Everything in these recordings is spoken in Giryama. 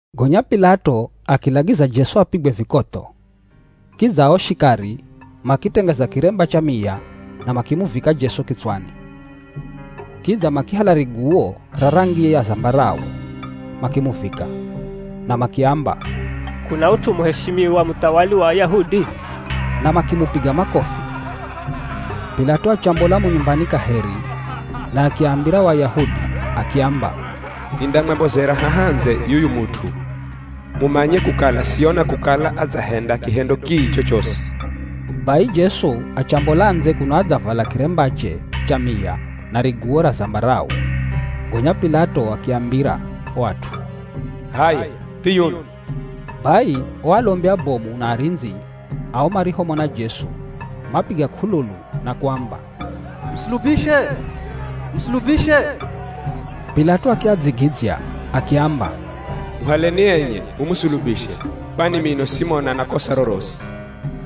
Gonya P'ilato akilagiza Jesu apigwe vikotho. Kidza ao shikari, makitengeza kiremba cha miya na makimuvika Jesu kitswani. Kidza makihala riguwo ra rangi ya zambarau makimuvika. Na makiamba, “K'una ut'u muheshimiwa muthawali wa Ayahudi?” Na makimupiga makofi. P'ilato achambola mo nyumbani kaheri na akiambira o Ayahudi akiamba, “Nindamwambozera haha ndze yuyu mut'u, mumanye kukala siona kukala adzahenda kihendo kii chochosi.” Bai Jesu achambola ndze kuno adzavala kirembache cha miya na riguwo ra zambarau. Gonya P'ilato akiambira o at'u, “H'aya thiyuno!” Bai o alombi abomu na arindzi ao marihomona Jesu, mapiga k'ululu na kuamba, “Musulubishe! Musulubishe!” P'ilato akiadzigidzya akiamba, “Muhaleni enye, mumusulubishe. Kwani mino simona na kosa rorosi.”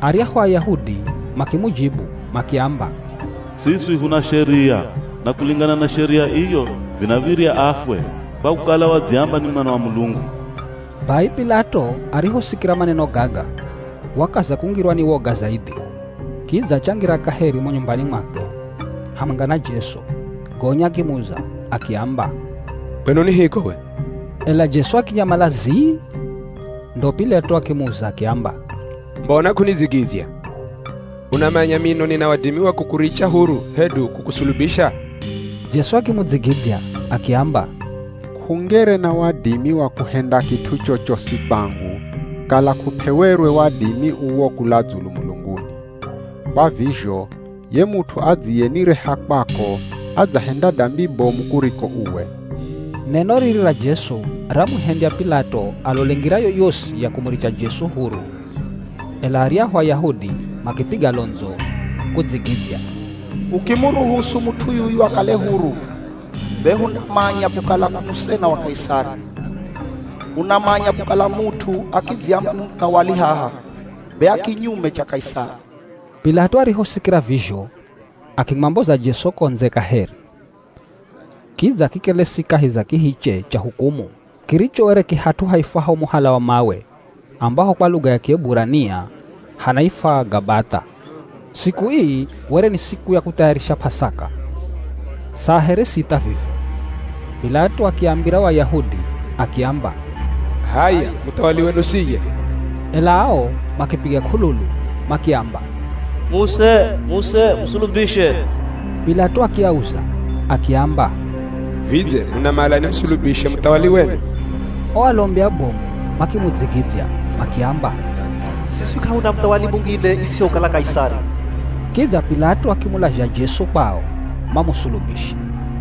Aryahu Ayahudi makimujibu makiamba, “Siswi huna sheria, na kulingana na sheria iyo vinav̱irya afwe, kwa kukala wadziamba ni Mwana wa Mulungu.” Bai P'ilato arihosikira maneno gaga, wakaza kungirwa ni woga zaidhi. Kidza achangira kaheri mo nyumbani mwakwe, hamwenga na Jesu. Gonya akimuza akiamba, “Kwenu ni hiko we?” Ela Jesu akinyamala zii. Ndo, P'ilato akimuza akiamba, “Mbona k'unidzigidzya? Unamanya mino nina wadimi wa kukuricha huru hedu kukusulubisha?” Jesu akimudzigidzya akiamba, “K'ungere na wadimi wa kuhenda kit'u chochosi kwangu, kala kup'ewerwe wadimi uwo kula dzulu mulunguni. Kwa vizho ye mut'u adziyenireha kwako adzahenda dambi bomu kuriko uwe.” Neno riri ra Jesu ramuhendya P'ilato alole ngira yoyosi ya kumuricha Jesu huru. Ela aryahu Ayahudi makipiga londzo kudzigidzya, “Ukimuruhusu mut'u yuyu akale huru be hundamanya kukala k'u musena wa Kaisari. Unamanya kukala mut'u akidziamba ni muthawali haha, be a kinyume cha Kaisari.” P'ilato arihosikira vizho akimwamboza Jesu ko ndze kaheri. Kidza akikelesi kahi za kihiche cha hukumu kiricho were ki hat'u haifwaho Muhala wa Mawe ambaho kwa luga ya Kieburania hanaifwa Gabath'a. Siku ii were ni siku ya Kuthayarishira P'asaka, saa here sitha vivi. P'ilato akiambira o Ayahudi akiamba, “H'aya Muthawali wenu siye!” Ela ao makipiga k'ululu makiamba, “Muse! Muse! Musulubishe!” P'ilato akiauza akiamba, “Vidze munamala nimusulubishe muthawali wenu?” O alombi abomu makimudzigidzya makiamba, “Siswi k'ahuna muthawali mungine isihokala Kaisari.” Kidza P'ilato akimulazha Jesu kwao mamusulubishe.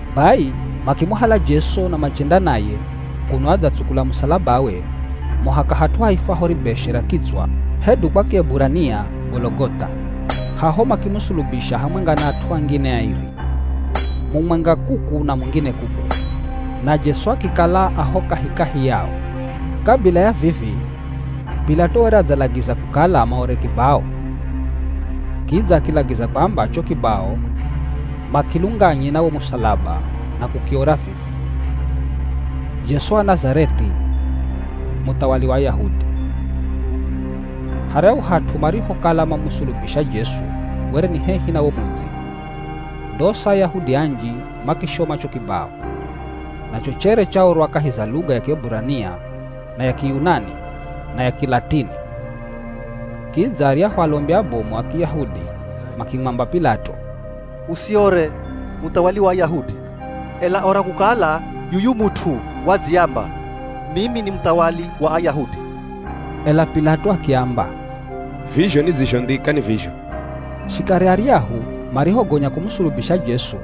Bai makimuhala Jesu na machenda naye kuno adzatsukula musalabawe muhaka hat'u haifwaho Ribeshe ra Kitswa hedu kwa Kieburania Gologoth'a. Haho makimusulubisha hamwenga na at'u angine airi, mumwenga kuku na mungine kuku, na Jesu akikala a ho kahikahi yao. Kabila ya vivi P'ilato were adzalagiza kukala maore kibao. Kidza akilagiza kwamba cho kibao makilunganye na wo musalaba na kukiora vivi: Jesu Wa Nazareth'i, Muthawali Wa Ayahudi. Haryahu hat'u marihokala mamusulubisha Jesu were ni hehi na wo mudzi. Ndosa Ayahudi anji makishoma cho kibao, nacho chere chaorwa kahi za luga ya Kieburania na ya Kiyunani na ya Kilatini. Kidza aryahu alombi abomu a Kiyahudi makimwamba P'ilato, “Usiore ‘Muthawali wa Ayahudi,’ ela ora kukala yuyu mut'u wadziamba, ‘Mimi ni Muthawali wa Ayahudi.’” Ela P'ilato akiamba, “Vizho nidzizhondhika ni vizho.” Shikari aryahu marihogonya kumusulubisha Jesu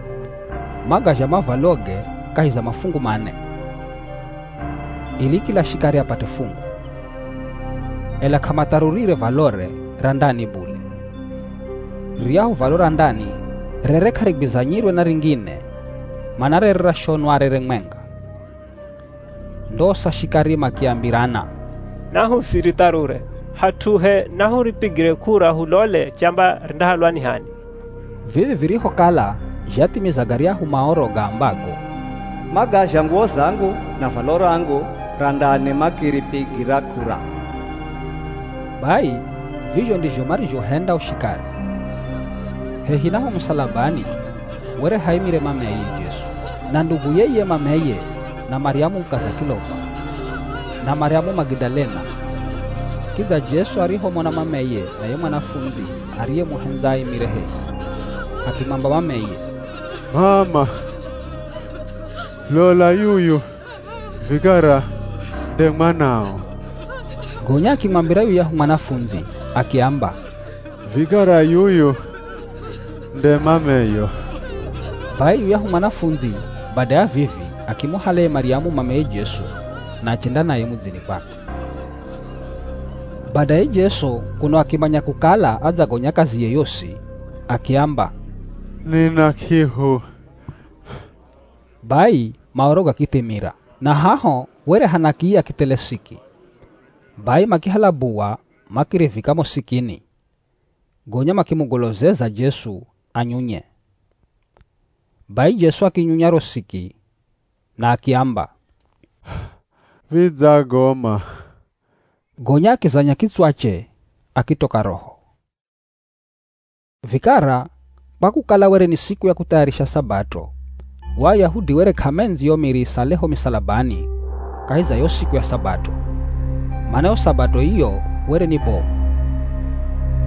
magazha mavwaloge kahi za mafungu mane, ili kila shikari apate fungu. Ela k'amatharurire valore ra ndani bule. Riryahu valo ra ndani rere k'arigwizanyirwe na ringine mana rere rashonwa rere mwenga. Ndosa shikari makiambirana, “Nahusiritharure, hat'uhe nahuripigire k'ura hulole chamba rindahalwa ni h'ani.” Vivi virihokala zhathimiza garyahu Maoro gaambago, “Magazha nguwo zangu na valo rangu ra ndani makiripigira k'ura.” Bai vizho ndizho marizhohenda o shikari. Hehi na ho musalabani were haimire mameye Jesu na nduguye iye mameye na Maryamu mukaza Kilopa, na Maryamu Magidalena. Kidza Jesu arihomona mameye na ye mwanafundzi ariyemuhendza aimire hehi, akimwamba mameye, “M'ama, lola yuyu vikara nde mwanao” Gonya akimwambira yuyahu mwanafundzi akiamba, “Vikara yuyu nde mameyo” Bai yuyahu mwanafundzi bada ya vivi akimuhala ye Maryamu mameye Jesu na achenda naye mudzini kwakwe. Badaye Jesu kuno akimanya kukala adzagonya kaziye yosi, akiamba, “Nina k'ihu” Bai Maoro gakithimira. Na haho were hana kiya kithele siki. Bai makihala buwa makirivika mo sikini, gonya makimugolozeza Jesu anyunye. Bai Jesu akinyunya ro siki, na akiamba, “Vidzagoma.” Gonya akizanya kitswache akitoka roho. Vikara kwa kukala were ni siku ya kuthayarishira Sabato, o Ayahudi were k'amendzi yo miri isale ho misalabani kahi za yo siku ya Sabato, mana yo Sabato iyo were ni bomu.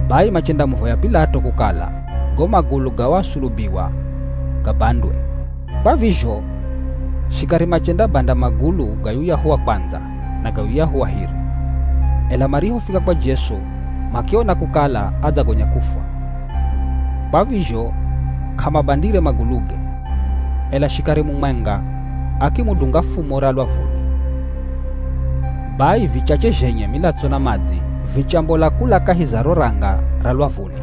Bai machendamuvoya P'ilato kukala go magulu ga o asulubiwa gabandwe. Kwa vizho shikari machendabanda magulu ga yuyahu wa kwandza na ga yuyahu wa hiri, ela marihofika kwa Jesu makiona kukala adzagonya kufwa, kwa vizho k'amabandire maguluge. Ela shikari mumwenga akimudunga fumo ra lwavuni. Bai vichache zhenye milatso na madzi vichambola kula kahi za ro ranga ra lwavuni.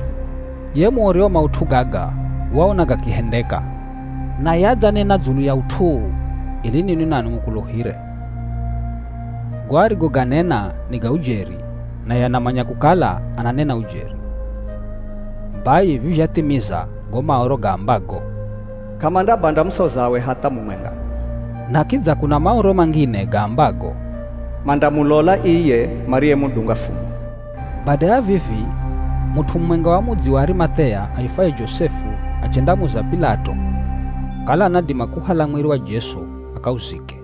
Ye muori wa maut'u gaga waona gakihendeka naye adzanena dzulu ya ut'u uu ili ninwi nanwi mukuluhire. Go arigoganena ni ga ujeri naye anamanya kukala ananena ujeri. Bai vivi zhathimiza go Maoro gaambago, “K'amandabanda musozawe hatha mumwenga.” Na kidza kuna Maoro mangine gaambago, “Mandamulola iye mariyemudunga fumo.” Bada ya vivi mut'u mumwenga wa mudzi wa Arimath'ea aifwaye Josefu achendamuza P'ilato, kala anadima kuuhala mwiri wa Jesu akauzike.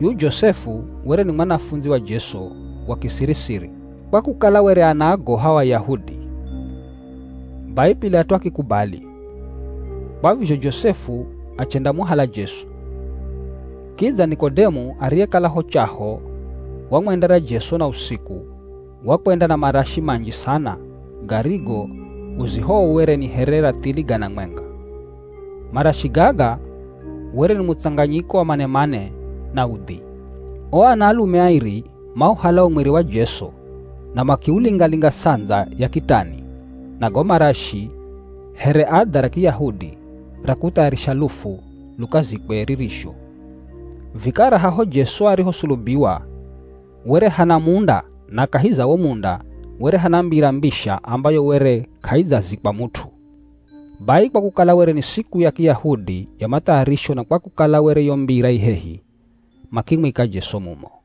Yuyu Josefu were ni mwanafundzi wa Jesu wa kisiri-siri, kwa kukala were anaagoha o Ayahudi. Bai P'ilato akikubali. Kwa vizho Josefu achendamuhala Jesu. Kidza Nikodemu ariyekala ho chaho wamwendera Jesu na usiku wakwenda na marashi manji sana garigo uzihowe were ni here rathili gana mwenga. Marashi gaga were ni mutsanganyiko wa manemane na udhi. O anaalume airi mauhala wo mwiri wa Jesu na makiulinga-linga ts'andza ya kitani na go marashi here adha ra Kiyahudi ra kuthayarisha lufu lukazikwe ririzho. Vikara haho Jesu arihosulubiwa were hana munda na kahi za wo munda were hana mbira mbisha ambayo were k'aidzazikwa mut'u. Bai kwa kukala were ni siku ya Kiyahudi ya Mathayarisho na kwa kukala were yo mbira i hehi, makimwika Jesu mumo.